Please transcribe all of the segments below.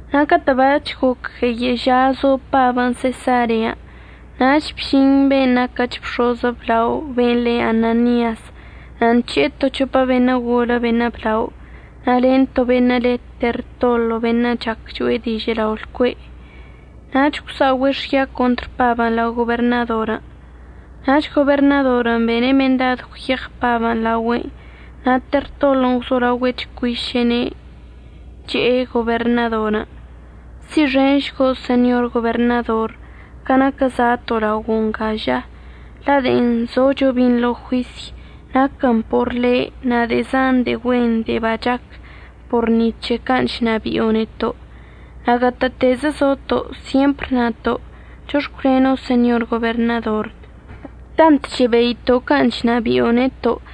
Na' catə' bac̱h goc gueyə' ža zo Pabən' Sesarean', nach bžin be'en naquəch bx̱oz əblao ben' le Ananias na' nc̱he'e to c̱hopə beṉə' golə beṉə' blao na' len to beṉə' le Tertolo beṉə' chac cho'e dižə' lao' lcue'. Nach gwsa'ogüe' xya contr Pabən' lao goberṉadorən'. Nach goberṉadorən' bene' mendad gwyeɉ Pabən' laogüe'enə' na' Tertolon' gwzolaogüe' chcuiše'ene', che'e goberṉadorən': ―Si'ixenšgo' Señor Goberṉador ca naquə za'ato' laogo' nga ža, la' de'en zocho binḻo juisy naquən por le' na' de'e zan de'e güen de'e bachac por ni c̱he can' chnabi'o neto'. Na' gatə'ətezə zoto' syempr nato' chox̱cwleno'onə' Señor Goberṉador, tant chebeito' can' chṉabi'o neto'.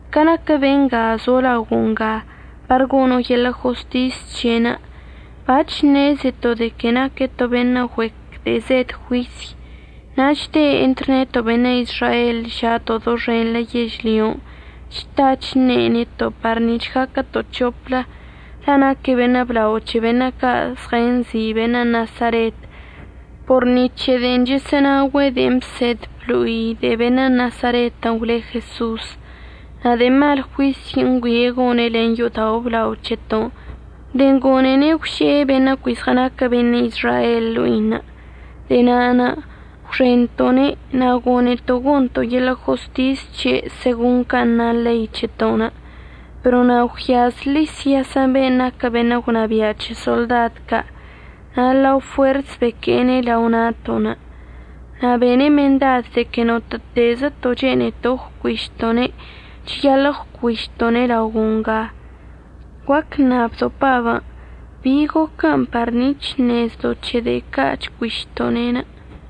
Ca naquə benga zo laogo' nga par gono' yeḻə' jostis c̱he'enə', bac̱h ṉezeto' de que naque' to beṉə' güec de'e zed juisy. Na' chde' entr neto' beṉə' Izrael ža'ato' doxenḻə yežlyon' chta chṉe' neto' par nic̱h gaquəto' c̱hoplə, la' naque' beṉə' blao c̱he beṉə' ca' zɉənzi' beṉə' Nasaret por ni c̱he de'en chəsə'ənaogüe' de'en əbsed əblo'i de'e beṉə' Nasaretən' gwle Jeso'os. Na' de'e mal juisy ngüie' gone' len yo'odao' əblao c̱heto'onə' de'en gone'ene' gwže'e beṉə' cui zɉənaquə beṉə' Izrael ḻo'inə'. De'e na'anə' gwxento'one', na' gone'eto' gonto' yeḻə' jostis c̱he' segon can' na ḻei c̱heto'onə'. Pero na' gwyaz Lisias ben' naquə beṉə' gwnabia' c̱he soḻdad ca', na' ḻa fuers beque'ene' lao na'ato'onə'. Na' bene' mendad de que notə'ətezəto' chene'eto' əgwcuišto'one' cheyaḻə' əgwcuišto'one' laogo' nga. Guac əṉabdo' Pabən' bin' goquə par nic̱h əṉezdo' c̱he de'e ca' chcuišto'one'.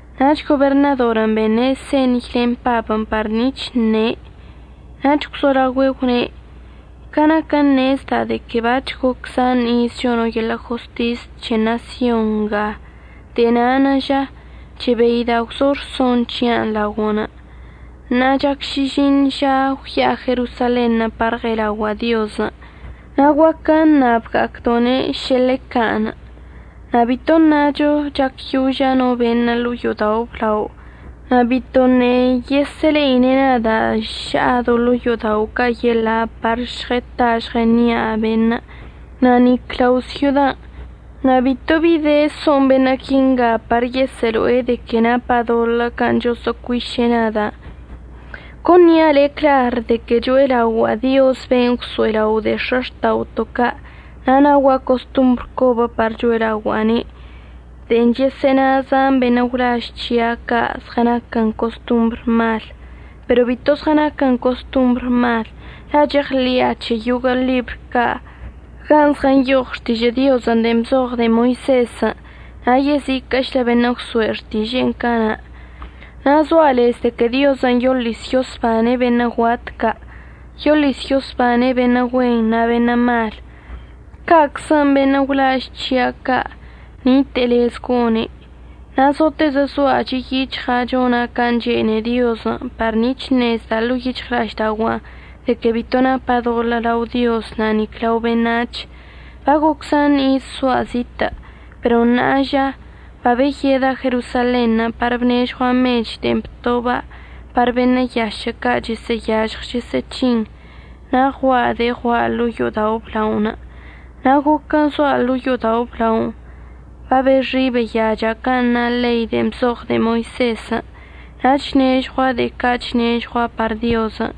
Nach goberṉadorən' bene' señy len Pabən' par nic̱h əṉe'. Nach gwzolaogüe' gwne': ―Ca naquə ṉezda' de que bac̱h goc zan iz chono' yeḻə' jostis c̱he ṉasyon nga, de'e na'anə' ža chebeida' gwzo rson c̱hia'anə' laogo'onə'. Ṉa'a chac šižiṉ žazə gwya'a Jerosalenṉə' par əɉe'elaogua'a Diozən'. Na' guaquə əṉabga'acdo'one' šə ḻe can'. Na' bito əṉacho chacyoža' no beṉə' ḻo'o yo'odao' əblaonə' na' bitoṉə' yesə'əle'ine' nada' ša'a do ḻo'o yo'odao' ca' yeḻa' par žɉəta žɉəṉia' beṉə', na' nic lao' syodan'. Na' bito bi de so'on beṉə' quinga par yesə'əlo'e de que napa' doḻə' can' choso'ocuiše' nada'. Con nia' le' clar de que cho'elaogua'a Dioz ben' gwso'elao' de'e x̱axta'oto' ca', na' naogua' costombr cobə par cho'elaogua'ane' de'en chəsə'əna zan beṉə' gwlaž c̱hia' ca' zɉənaquə costombr mal. Pero bito zɉənaquən costombr mal, la' cheɉḻi'a c̱he yoguə' ḻibr ca' gan' zɉənyoɉ Xtižə' Diozən' de'en bzoɉ de'e Moisezən' na' yeziquə'əchlə beṉə' gwso'e xtiže'enə' cana'. Na' zoa' lez de que Diozən' yoḻis yosbane' beṉə' guat ca'. Yoḻis yosbane' beṉə' güen na' beṉə' mal, ca'aczən' beṉə' gwlaž c̱hia' ca' nite'e lez gone'. Na' zotezə zoa' chi' yic̱hɉa' chona' can' chene'e Diozən' par nic̱h ṉezda' ḻo'o yic̱hɉla'aždaogua'anə' de que bito napa' doḻə' lao Diozən' na' nic lao beṉac̱hən'. Bagoc zan iz zoa' zitə', pero ṉa'a ža babeyeda' Jerosalenṉə' par bnežɉua' mech de'en btoba' par beṉə' yašə' ca' chəsə'əyažɉ chəsə'əc̱hine' na' ɉua'a de'e ɉua'a ḻo'o yo'odao' əblaonə'. Na' goquən' zoa' ḻo'o yo'odao' əblaonə' babexi' beyacha' can' na ḻei de'en bzoɉ de'e Moisezən', na' chnežɉua' de'e ca' chnežɉua' par Diozən'.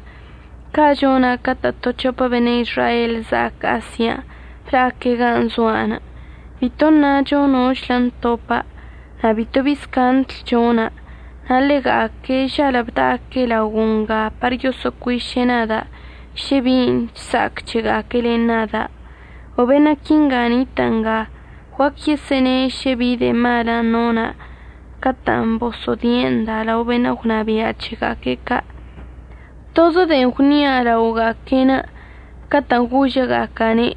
Ca' chona' catə' to c̱hopə beṉə' Izrael za'ac Asian' bla'aque' gan' zoa'anə'. Bito əṉacho nochlə ntopa' na' bitobi scandl chona'. Na' ḻega'aquen' žalə' bda'aque' laogo' nga par yoso'ocuiše' nada' šə bin' chsa'ac c̱hega'aque' len nada'. O beṉə' quinga nitə' nga guac yesə'əne' šə bi de'e malən' nona' catə'ənə' boso'odie' nda' lao beṉə' gwnabia' c̱hega'aque' ca'. Tozə de'en gwnia' laoga'aque'en, catə'ən gožəga'aca'ane':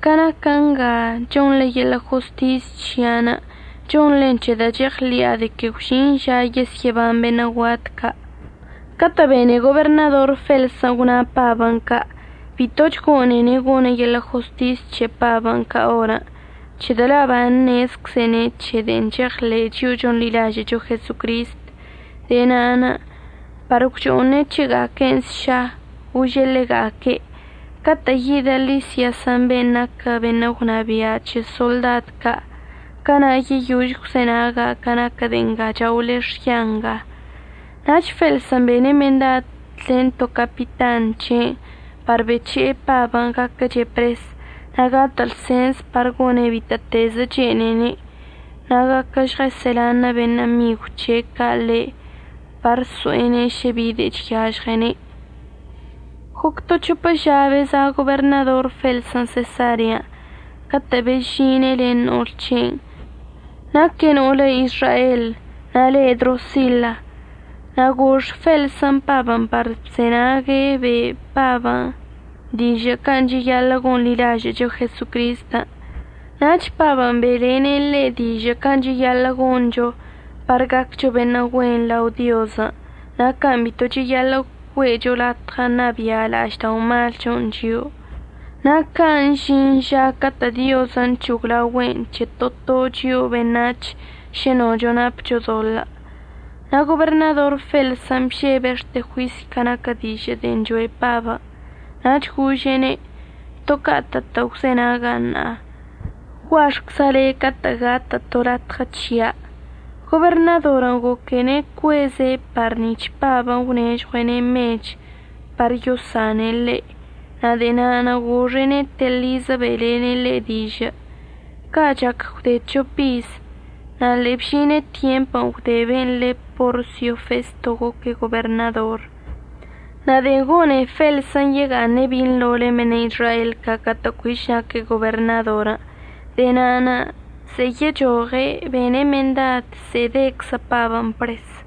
“Ca naquə nga chonḻe yeḻə' jostis c̱hia'anə', chonḻen c̱hedə' cheɉḻi'a de que gwžin ža yesyə'əban beṉə' guat ca'.” Catə' bene goberṉador Felsən' gwna Pabən' ca', bitoch gone'ene' gone' yeḻə' jostis c̱he Pabən' ca orən', c̱hedə' la' baṉezczene' c̱he de'en cheɉḻe'e chio'o chonḻilažə'əcho Jesocristən'. De'e na'anə' par gwcho'one' c̱hega'aquen' sša gože' ḻega'aque': ―Catə' yidə Lisiasən' ben' naquə beṉə' gwnabia' c̱he soḻdad ca', cana' yeyož gwzenaga' ca naquə de'e nga chaole xya nga. Nach Felsən' bene' mendad len to capitan c̱he' par bec̱he'e Pabən' gaquəche' pres na' gatə' lsens par gone' bitə'ətezə chene'ene' na' guaquə žɉəsə'əlanə' beṉə' migw c̱he' ca' ḻe' par əso'ene' šə bi de'e chyažɉene'. Goc to c̱hopə ža beza' goberṉador Felsən' Sesarean' catə' bezžine' len no'ol c̱he'enə'. Naque' no'olə Izrael na' le' Drosila. Na' gox Felsən' Pabən' na' bzenague' be' Pabən' dižə' can' cheyaḻə' gonḻilažə'əcho Jesocristən'. Nach Pabən' be'elene' ḻe' dižə' can' cheyaḻə' goncho par gaccho beṉə' güen lao Diozən' na' can' bito cheyaḻə' güe'echo latɉə ṉabia' la'ažda'omalchon' chio'o, na' can' əžin ža catə' Diozən' c̱hoglaogüe'en c̱he to to chio'o beṉac̱h šə nocho napcho doḻə'. Na' goberṉador Felsən' bžebe' xte juisy ca naquə dižə' de'en choe' Pabən'. Nach gože'ene': ―To ca'atə'ətə' gwzenaga' ṉa'a. Guaxcza' le' catə' gatə' to latɉə c̱hia'. Goberṉadorən' goquene' cueze' par nic̱h Pabən' əgwnežɉue'ene' mech par yosane' ḻe', na' de'e na'anə' goxe'ene' telizə be'elene' ḻe' dižə'. Ca' chac gwde c̱hop iz, na' ḻe'e bžine tyemp gwde ben' le Porsio Festo goque' goberṉador. Na' de'en gone'e Felsən' yega'aṉe' binḻo len beṉə' Izrael ca' catə' cuich naque' goberṉadorən', de'e na'anə' ze'e yechoɉe' bene' mendad ze'e deczə Pabən' pres.